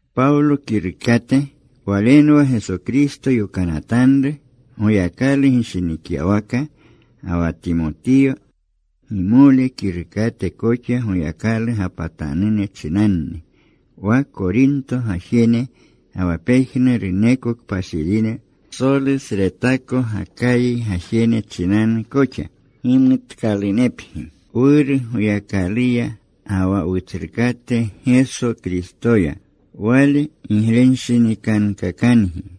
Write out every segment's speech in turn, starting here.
Pawlo kirukate. Walenwa Geso Kristo yokanatanru Goyakalu gishinikyawaka. Ga wa Timotiyo, gimole, kirukate koxa. Goyakalu gapatanune chinanni, wa Korinto gajene, ga wa pejnuruneko kpashirine, psolusretako Gakayi gajene chinanu koxa. Gimutkalunepgi Wuru Goyakaluya ga wa Wutsrukate Geso Kristoya. Wale giglewanshinikankakangi.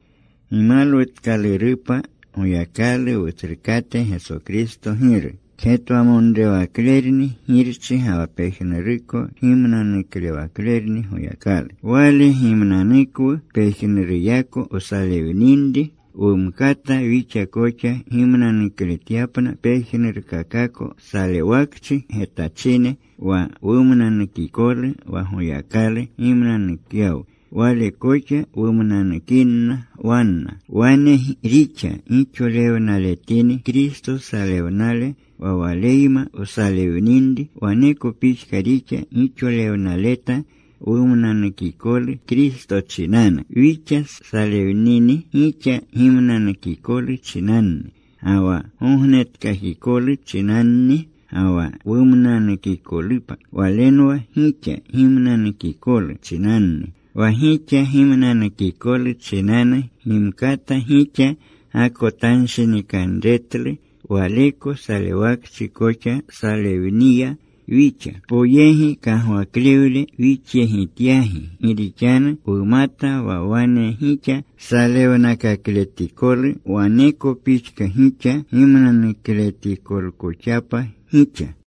Gimalwutkalurupa Goyakalu, Wutsrukate Geso Kristo Giru. Kgetwamonrewaklerni Girchi, ga wa pejnuruko kgimnanuklewaklerni Goyakalu. Wale gimnanukwu pejnuruyako wsalewninri, wumkata wixa koxa gimnanukletyapna pejnurkakako salewakchi getachine. Wa wumnanukikolu wa Goyakalu gimnanukyawu wale koxa wumnanukinna wanna. Wane rixa gixolewnaletinri Kristo salewnale wa Waleyma wsalewninri, waneko pixka rixa gixolewnaleta wumnanukikolu Kristo chinanu. Wixa salewnini, gixa gimnanukikolu chinanni ga wa gognetkakikolu chinanni. Ga wa wumnanuukoklunupa walenwa gixa gimnanukikolu chinanni. Wa gixa gimnanukikolu chinanu gimkata gixa gakotanshinikanretlu waleko salewakchi koxa wsalewniya wixa. Poyegi kagwaklewle wixyegityagi gi rixanu wumata wa wane gixa salewnakakletikolu, waneko pixka gixa gimnanuukakletikolkoxapa gixa.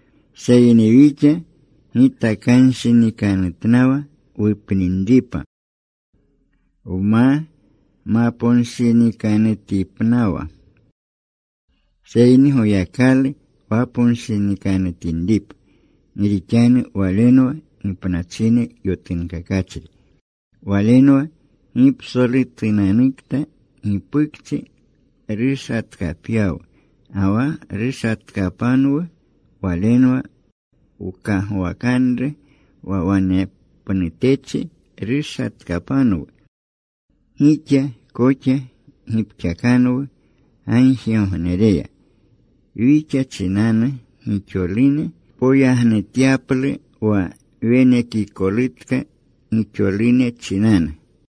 Seyni wixa gitakanshinikanutnawa wupninripa, wma maponshinikanutinitipnawa, seyni Goyakalu waponshinikanutinripa, gi rixanu Walenwa gipnachine yotunkakachri. Walenwa gipsolutunanukta gipukchi rushatkapyawu. Ga wa rushatkapanwu. Walenwa wkagwakanru wa wanepnutechi rushatkapanwu. Gixa koxa gipxakanwu gagjigognereya, wixa chinanu gixolune poyagnutyaplu wa wenekikolutka gixolune chinanu.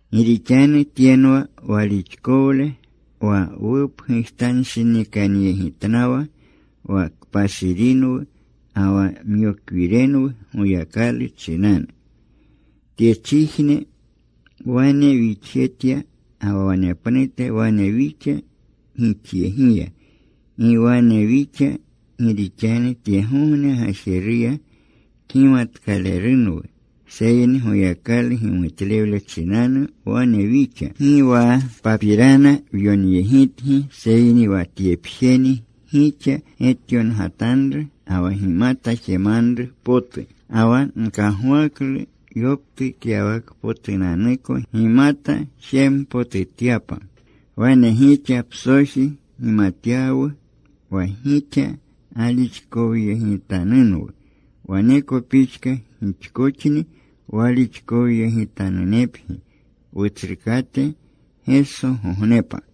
Gi rixanu tyenwa walixkowle: wa wupgujtanshinikanyegitnawa wa kpashirinwu ga wa myokwirenwu Goyakalu chinanu. Tyechijne wane wixjetya, ga wa wanepnute wane wixa gixyegiya. Gi wane wixa gi rixanu tyegogne gajeruya kgimatkalerunwu, seyni Goyakalu gimutlewle chinanu wane wixa. Gi wa papirana wyonyegitgi, seyni wa tyepjeni gixa getyongatanru ga wa gimata jemanru potu. Ga wa nkagwaklu yoptukyawakpotunanuko gimata jempotutyapa. Wane gixa psoji gimatyawu wa gixa galixkowyegitanunwu. Waneko pixka gixkoxni walixkowyegitanunepgi Wutsrukate Gesogognepa.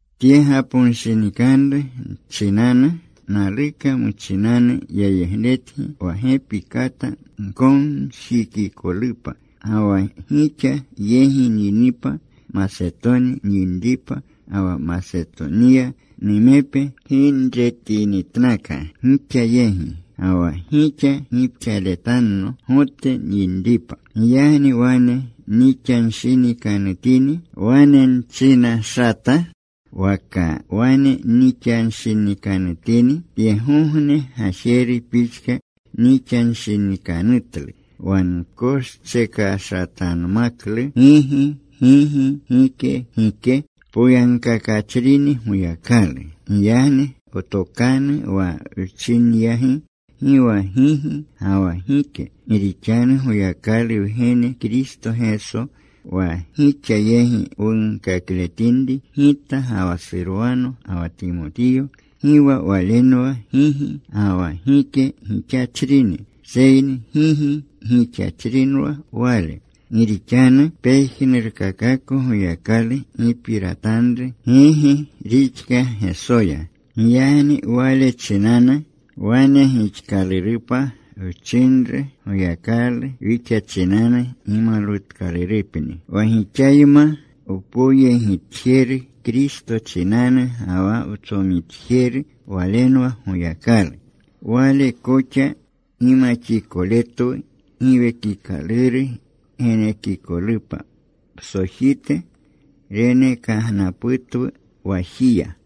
Tye gaponshinikanru chinanu, naluka muchinanu yayegletgi wa gepi kata gkomjikikolupa. Ga wa gixa yegi nyinipa, Masetoni nyinripa, ga wa Masetoniya numepe ginretinitnaka gixa yegi. Ga wa gixa gipxaletanno Gote nyinripa. Giyagni wane nixanshinikanutini, ¿wane nchinashata? ¿Waka wane nixanshinikanutini, tyegogne gajeru pixka nixanshinikanutlu, wa nkoschekashatanmaklu gigi, gigi; gike, gike? Poyagkakachrini Goyakalu. Giyagni wtokanu wa wchinyagi gi wa gigi ga wa gike. Gi rixanu Goyakalu Wgene Kristo Geso, wa gixa yegi wunkakletinri gita ga wa Surwano ga wa Timotiyo, gi wa Walenwa gigi ga wa gike gixachrini. Seyni gigi gixachrinwa Wale. Gi rixanu pejnurkakako Goyakalu gipiratanru gigi rixka Gesoya. Giyagni Wale chinanu, Wane gixkalurupa wchinru Goyakalu, wixa chinanu gimalwutkalurupni. Wa gixayma wpoyegitjeru Kristo chinanu ga wa wtsomitjeru Walenwa Goyakalu. Wale koxa gimaxikoletwu. Giwekikaluru genekikolupa psojite renekagnaputwu wajiya.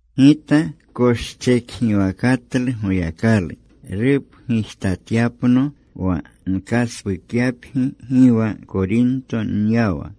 Gita koschekgiwakatlu Goyakalu rupgujtatyapno, wa nkaspukyapgi gi wa Korinto nyawa.